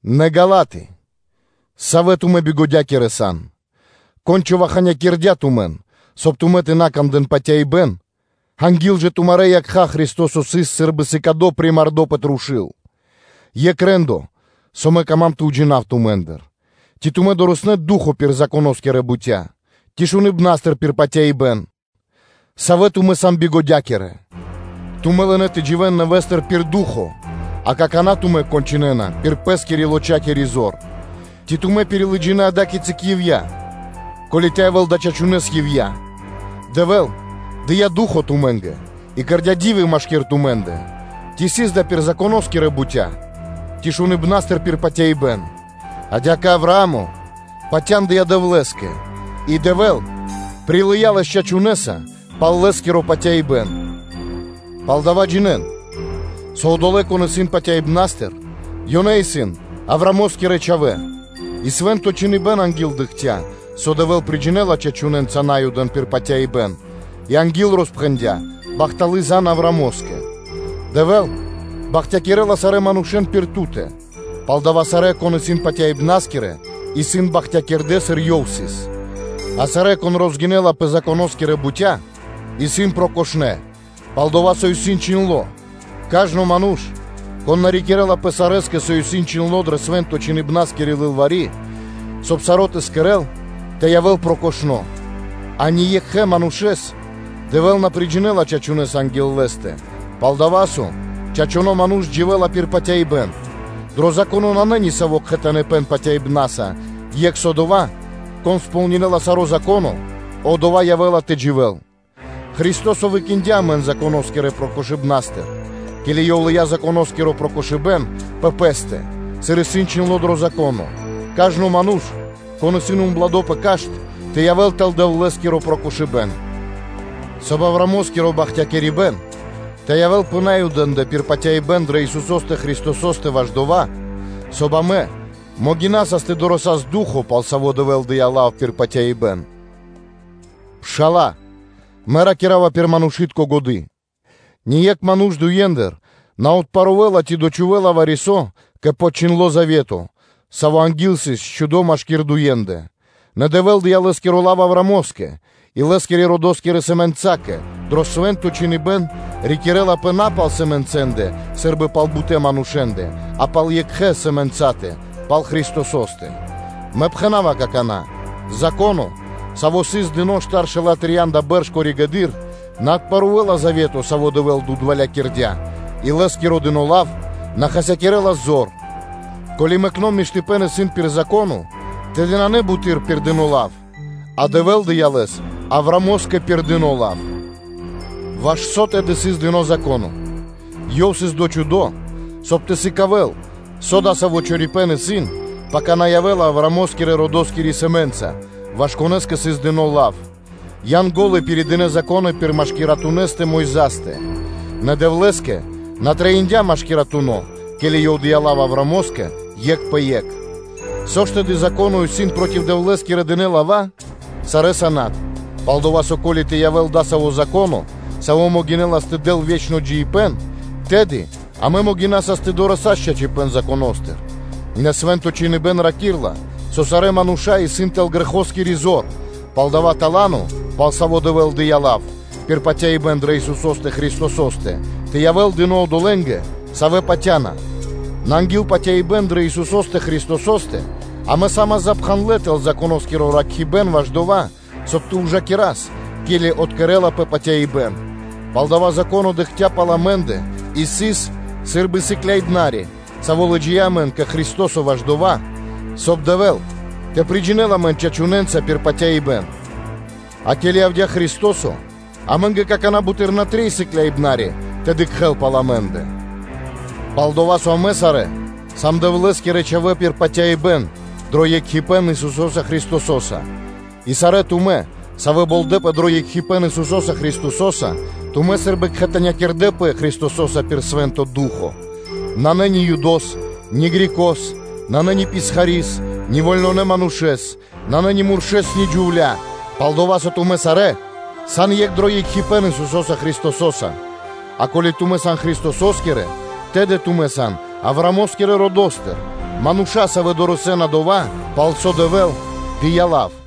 Нэ, Галаты, савэ́ тумэ́ бигодякирэ сан! Кон дава́ човаханякирдя тумэн, соб (кай) тумэ́ тэ на кандэ́н патяибэ́н; анги́л жа тумарэ́ якха́ Христо́со сыс сы́рбы сыкадо примардо пэ трушу́л? Екх рэ́ндо (де́ло), со мэ кама́м тэ уджинав тумэ́ндыр: ци тумэ́ дорэснэ́ (долынэ) Ду́хо (Фа́но) пир Законо́скирэ бутя́? Ци шуныбнастыр пир патяибэ́н? Савэ тумэ́ сан бигодякирэ! Тумэ́ лынэ́ тэ дживэ́н нэвэ́стыр пир Ду́хо (Фа́но), а какана́ тумэ́ кончынэна пир пэ́скирэ-лочакири зор. Ци тумэ́ пирилыджинэ ада́кицы ивья́ (напра́снэс)? Ко́ли тэ явэ́л дава́ чачунэ́с ивья́? Дэвэ́л дыя́ Ду́хо (Фа́но) тумэ́нгэ и кэрдя́ ди́вы машки́р тумэ́ндэ, ци сыс дава́ пир Законо́скирэ бутя́, ци шуныбнастыр пир патяибэ́н? Адя́кэ Авраа́мо патяндыя Дэвлэ́скэ и Дэвэ́л прилыя́ лэс чачунэса пал лэ́скиро патяибэ́н. Палдава́, джинэ́н, со одолэ́, кон исын патяибнастыр, ёнэ исын Авраамо́скирэ чхавэ́. И Свэ́нто Чхиныбэ́н анги́л дыкхця́, со Дэвэ́л приджинэла чачунэнца Наюдэн пир патяибэ́н, и анги́л роспхэндя́ бахталы́ зан (звесь) Авраамо́скэ: “Дэвэ́л бахтякирэ́ла сарэ́ манушэ́н пир ту́тэ.” Палдава́, сарэ́, кон исын патяибнаскирэ, исын бахтякирдэ, сыр Ёв сыс. А сарэ́, кон розгинэла пэ Законо́скирэ бутя́, исын прокошнэ, пал-дова́ со исын чхиндло́: “Кажно ману́ш, кон на рикирлапэ сарэскэ, соб (кай) саро́ тэ кэрэ́л, со исын чхиндло́ дрэ Свэнтонэ́-Чхиныбнаскири лылвари́, соб (кай) тэ явэ́л прокошно́!” а ни екхэ манушэ́с Дэвэ́л на приджинэла чачунэса анги́л Лэ́стэ, пал-дова́ со: “Чачуно́ ману́ш дживэ́ла пир патяибэ́н.” Дро Зако́но нанэ ни саво́ кхэтаныпэн патяибна́са, екх со дова́: “Кон сполнинэла саро́ Зако́но, одова́ явэ́ла тэ дживэ́л.” Христо́со выкиндя амэн Законо́скирэ прокошыбнастыр, ке́ли Ёв лыя́ Законоскиро прокошыбэ́н пэ Пэ́стэ, сыр исын чхиндло́ дро Зако́но: “Кажно ману́ш, кон исын убладо пэ кашт, тэ явэ́л тэл Дэвлэ́скиро прокошыбэ́н”, соб (кай) Авраамо́скиро бахтякирибэ́н тэ явэ́л пэ Наюдэ́ндэ пир патяибэ́н дрэ Исусо́стэ Христосо́стэ ваш дова́, соб (кай) амэ могинасас тэ дорэсас (тэ долас) Ду́хо (Фа́но), пал Саво́ Дэвэ́л дыя́ лав пир патяибэ́н. Пшала́лэ! Мэ ракира́ва пир манушы́тко годы́: ние́кх ману́ш дуендыр на отпарувэла ци дочхувэла вари-со кэ подчхиндло завето, саво́ анги́л сыс счхудо машки́р дуендэ. Нэ Дэвэ́л дыя́ Лэ́скиро лав Авраамо́скэ и лэ́скирэ-чхавэ́нгирэ чхавэ́нгэ: дро Свэ́нто Чхиныбэ́н ракирлапэ на пал “сэмэнцэндэ” сы́рбы пал бутэ́ манушэ́ндэ, а пал екхэ “сэмэнцатэ”, пал Христосо́стэ. Мэ пхэна́ва какана́: Зако́но, саво́ сыс дыно́ штаршэла́ трия́нда бэрш коригэды́р (позжэды́р), на отпарувэла завето, саво́ Дэвэ́л дудвалякирдя (утвердиндя), и лэ́скиро дыно́ лав на хасякирэ́ла зор. Ко́ли мэкно́ миштыпэ́н исын пир Зако́но, тэды нанэ буты́р пир дыно́ лав, а Дэвэ́л дыя́ лэс Авраамо́скэ пир дыно́ лав. Ваш со тэды сыс дыно́ Зако́но? Ёв сыс дочхудо, соб (кай) тэ сыкавэ́л, со дасаво чорипэ́н исын, пака на явэ́ла Авраамо́скирэ-родоскири сэмэ́нца, ваш конэ́скэ сыс дыно́ лав; Янго́лы пиридынэ Зако́но пир машкиратунэстэ (посредникостэ) – Мойзастэ. Нэ Дэвлэ́скэ на трэиндя́ машкиратуно, ке́ли Ёв дыя́ лав Авраамо́скэ екх пэ екх. Со ж тэды Зако́но исын проти Дэвлэ́скирэ дынэ́ лава́? Сарэ́са над! Пал-дова́ со, ко́ли тэ явэ́л дасаво Зако́но, саво́ могинэлас тэ дэл ве́чно джиибэ́н, тэды амэ могинасас тэ дорэсас чачипэ́н Законо́стыр; нэ Свэ́нто Чхиныбэ́н ракирэ́ла, со сарэ́ мануша́ исын тэл грэхоскири зор, палдава́ бахталыпэ́н, пал саво́ Дэвэ́л дыя́ лав, пир патяибэ́н дрэ Исусо́стэ Христосо́стэ, тэ явэ́л дыно́ одолэ́нгэ, савэ́ патя́на. Нэ анги́л патяибэ́н дрэ Исусо́стэ Христосо́стэ, амэ са́мас сы́рбы запхандлэ тэл Законоскиро ракхибэн ваш дова́, соб (кай) тэ ужакирас, ке́ли откэрэлапэ патяибэ́н. Палдава́ Зако́но дыкхця́ пал амэ́ндэ и сыс сы́рбы сыкляибнари (воспитателё), саво́ лыджия́ амэн кэ Христо́со ваш дова́, соб (кай) Дэвэ́л тэ приджинэл амэн чачунэнца пир патяибэ́н. А ке́ли явдя́ Христо́со, амэ́нгэ какана́ буты́р на трэй сыкляибнари тэ дыкхэ́л пал амэ́ндэ; пал-дова́ со амэ сарэ́ сам Дэвлэ́скирэ чхавэ́ пир патяибэ́н, дро екхипэ́н Исусо́са Христосо́са. И сарэ́ тумэ́, савэ́ болдэпэ дро екхипэ́н Исусо́са Христосо́са, тумэ́ сы́рбы кхэтанякирдэпэ Христосо́са пир Свэ́нто Ду́хо (Фа́но). Нанэ ни Юдос, ни Грекос; нанэ ни писхари́с, ни вольнонэ манушэ́с; нанэ ни муршэ́с, ни джувля́; пал-дова́ со тумэ́ сарэ́ сан екх дро екхипэ́н Исусо́са Христосо́са. А ко́ли тумэ́ сан Христосо́скирэ, тэды тумэ́ сан Авраамо́скирэ родо́стыр; мануша́, савэ́ дорэсэ́на дова́, пал со Дэвэ́л дыя́ лав.